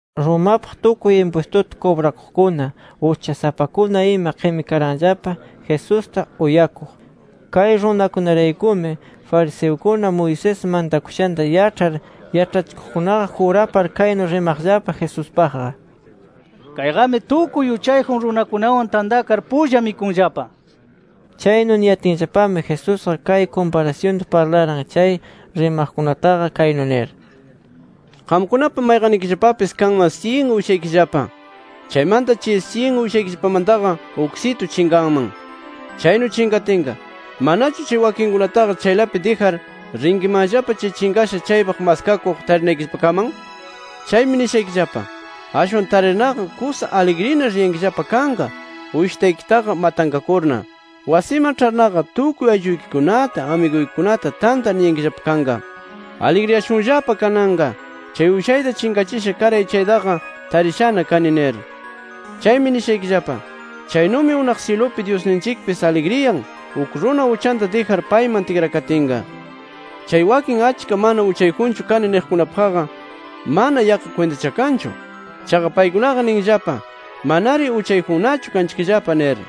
Romapaq tukuy impwistuta kubrakuqkuna, uchasapakuna ima qimikaranllapa, Jesusta uyakuq. Kay runakunaraykumi fariseukuna, Moisés mantakushanta yaĉhar yaĉhachikuqkunaqa, jurapar kaynu rimaqllapa Jesuspaqqa: “Kayqami tukuy uchayjun runakunawan tantakar pulla mikunllapa” nir. Chaynu niyatinllapami Jesusqa kay kumparasyunta parlaran chay rimaqkunataqa kaynu nir: “Qamkunapa mayqannikillapapis kanman syin uyshaykillapa. Chaymanta chay syin uyshaykillapamantaqa uksitu chinqanman. Chaynu chinqatinqa, ¿manachu chay wakinkunataqa chaylapi dijar rinkimanllapa chay chinqasha chaypaq maskakuq tarinaykillapakaman? Chaymi nishaykillapa: Ashwan tarirnaqa kusa aligrina riyankillapa kanqa uyshitaykitaqa matanqakurna. Wasiman ĉharnaqa tukuy aylluykikunata, amiguykikunata tantar niyankillapa kanqa: ‘Aligriyashunllapa kananqa, chay uyshayta chinqachisha karay, chaytaqa tarishana kani’ nir. “Chaymi nishaykillapa: Chaynumi unaq syilupi Dyusninchikpis aligriyan, uk runa uchanta dijar payman tikrakatinqa. Chay wakin achka mana uchayjunchu kani niqkunapaqqa mana yaqqa kwintachakanchu. Chaqa paykunaqa ninllapa manari uchayjunnachu kanchikllapa nir.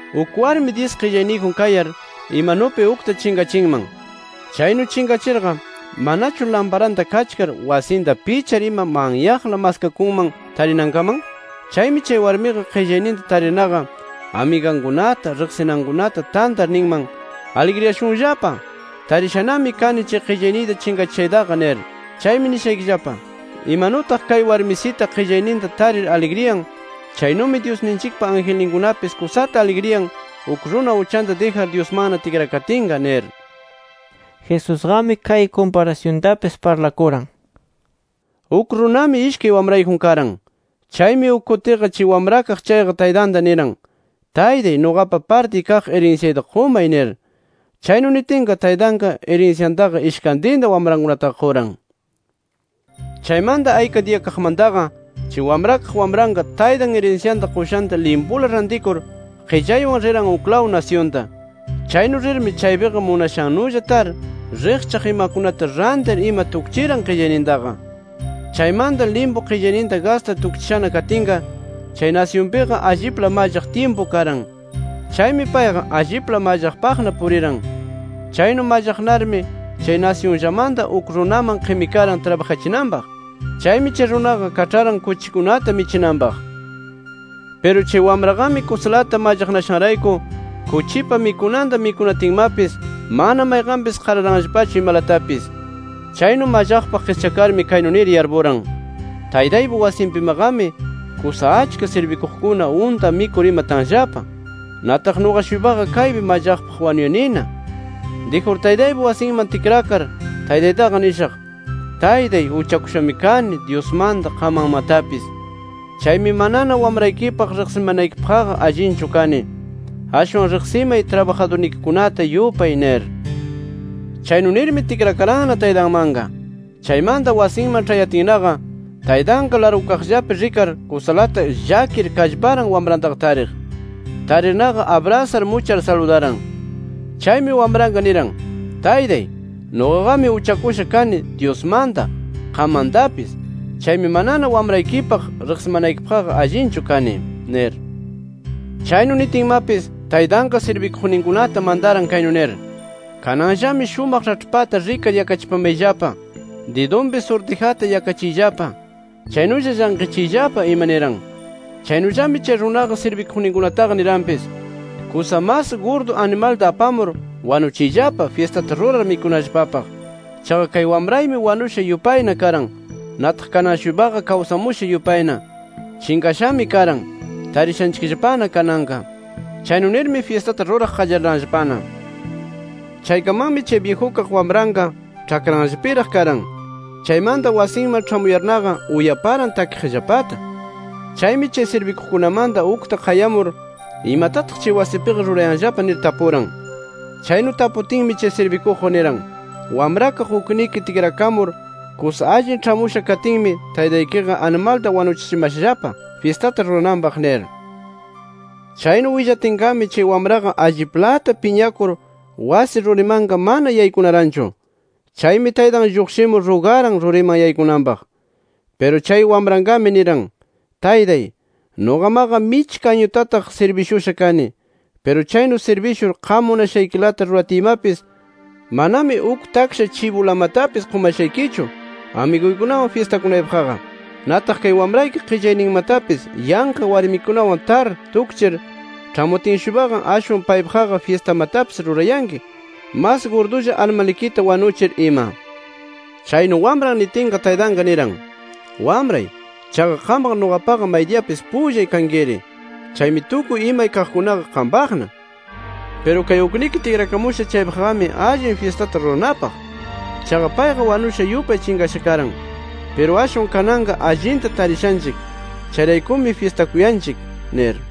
“Uk warmi dyis qillayniyjun kayar, imanupi ukta chinqachinman. Chaynu chinqachirqa, ¿manachu lamparanta kachkar, wasinta pichar ima manyaqla maskakunman tarinankaman? Chaymi chay warmiqa, qillayninta tarirnaqa amigankunata, riqsinankunata tantar ninman: ‘Aligriyashunllapa, tarishanami kani chay qillayniyta chinqachishaytaqa’ nir. “Chaymi nishaykillapa: Imanutaq kay warmisita qillayninta tarir aligriyan, chaynumi Dyusninchikpa angelninkunapis kusata aligriyan, uk runa uchanta dijar Dyusmanna tikrakatinqa nir”. Jesusqami kay kumparasyuntapis parlakuran: “Uk runami ishkay wamrayjun karan. Chaymi uk kutiqa chay wamrakaq chayqa taytanta niran: ‘Taytay nuqapa partiy kaq irinsyayta qumay’ nir. Chaynu nitinqa taytanqa irinsyantaqa ishkantinta wamrankunataqa quran. “Chaymanta ayka diyakaqmantaqa chay wamrakaq wamranqa, taytan irinsyanta qushanta limpula rantikur, qillaywan riran uklaw nasyunta. Chaynu rirmi chaypiqa munashannulla tar, riqchaq imakunata rantir ima tukchiran qillaynintaqa. “Chaymanta limpu qillayninta gastar tukchishana katinqa, chay nasyunpiqa allipla mallaq tyimpu karan. Chaymi payqa allipla mallaqpaqna puriran. Chaynu mallaqnarmi, chay nasyunllamanta uk runaman qimikaran trabajachinanpaq. Chaymi chay runaqa kaĉharan kuchikunata michinanpaq. Piru chay wamraqami kusalata mallaqnashanrayku kuchipa mikunanta mikunatinmapis, mana mayqanpis qararanllapachu imalatapis. “Chaynu mallaqpaq qischakarmi kaynu nir yarpuran: Taytaypa wasinpimaqami kusa achka sirbikuqkuna unta mikur ima tanllapa. ¡Nataq nuqa-shuypaqa kaypi mallaqpaq wanuyanina! Dijur taytaypa wasinman tikrakar, taytaytaqa nishaq: ‘Taytay, uchakushami kani Dyusmanta, qammantapis. Chaymi, manana wamraykipaq riqsimanaykipaqqa allinchu kani. Ashwan riqsimay trabajadurnikikunata yupay’ nir. Chaynu nirmi, tikrakaranna taytanmanqa. “Chaymanta wasinman ĉhayatinnaqa, taytanqa largukaqllapi rikar, kusalata llakir kallparan wamrantaqa tariq. Tarirnaqa abrasar muchar saludaran. Chaymi wamranqa niran: ‘Taytay, nuqaqami uchakusha kani Dyusmanta, qammantapis. Chaymi manana wamraykipaq riqsimanaykipaqqa allinchu kani’ nir. “Chaynu nitinmapis, taytanqa sirbikuqninkunata mantaran kaynu nir: ‘Kananllami shumaq raĉhpata rikar yakachipamayllapa; didunpi surtijata yakachiyllapa, chaynulla llanqichiyllapa ima’ niran. Chaynullami chay runaqa sirbikuqninkunataqa niranpis: ‘Kusa mas gurdu animalta apamur wanuchiyllapa, fyistata rurar mikunallapapaq. Chaqa kay wamraymi wanusha yupayna karan. Nataq kanan-shuypaqa kawsamusha yupayna. Chinqashami karan, tarishanchikllapana kananqa’. Chaynu nirmi fyistata ruraq qallariranllapana. “Chaykamanmi, chay byijukaq wamranqa ĉhakranllapiraq karan. Chaymanta wasinman ĉhamuyarnaqa, uyaparan takiqllapata. Chaymi chay sirbikuqkunamanta ukta qayamur, imatataq chay wasinpiqa rurayanllapa, nir tapuran. Chaynu taputinmi chay sirbikuqqa niran: ‘Wamrakaq ukniki tikrakamur kusa allin ĉhamusha katinmi, taytaykiqa animalta wanuchichimashallapa, fyistata rurananpaq’ nir. “Chaynu willatinqami, chay wamraqa alliplata piñakur wasi rurimanqa mana yaykunaranchu. Chaymi taytan lluqshimur rugaran ruriman yaykunanpaq. Piru chay wamranqami niran: ‘Taytay, nuqamaqa michka añutataq sirbishusha kani. Piru chaynu sirbishur, qam munashaykilata ruratiymapis manami uk taksha chibulamatapis qumashaykichu, amiguykunawan fyistakunaypaqqa. Nataq kay wamrayki qillayninmatapis yanqa warmikunawan tar tukchir, ĉhamutin-shuypaqa, ashwan paypaqqa fyistamatapis rurayanki mas gurdulla animalnikita wanuchir ima’. “Chaynu wamran nitinqa, taytanqa niran: ‘Wamray, chaqa qamqa nuqapaqa maydiyapis pullay kankiri. Chaymi tukuy imay kaqkunaqa qampaqna. Piru kay ukniki tikrakamusha chaypaqqami allin fyistata ruranapaq. Chaqa payqa wanusha yupay chinqasha karan. Piru ashwan kananqa allinta tarishanchik. Chayrayku fyistakuyanchik’ nir”.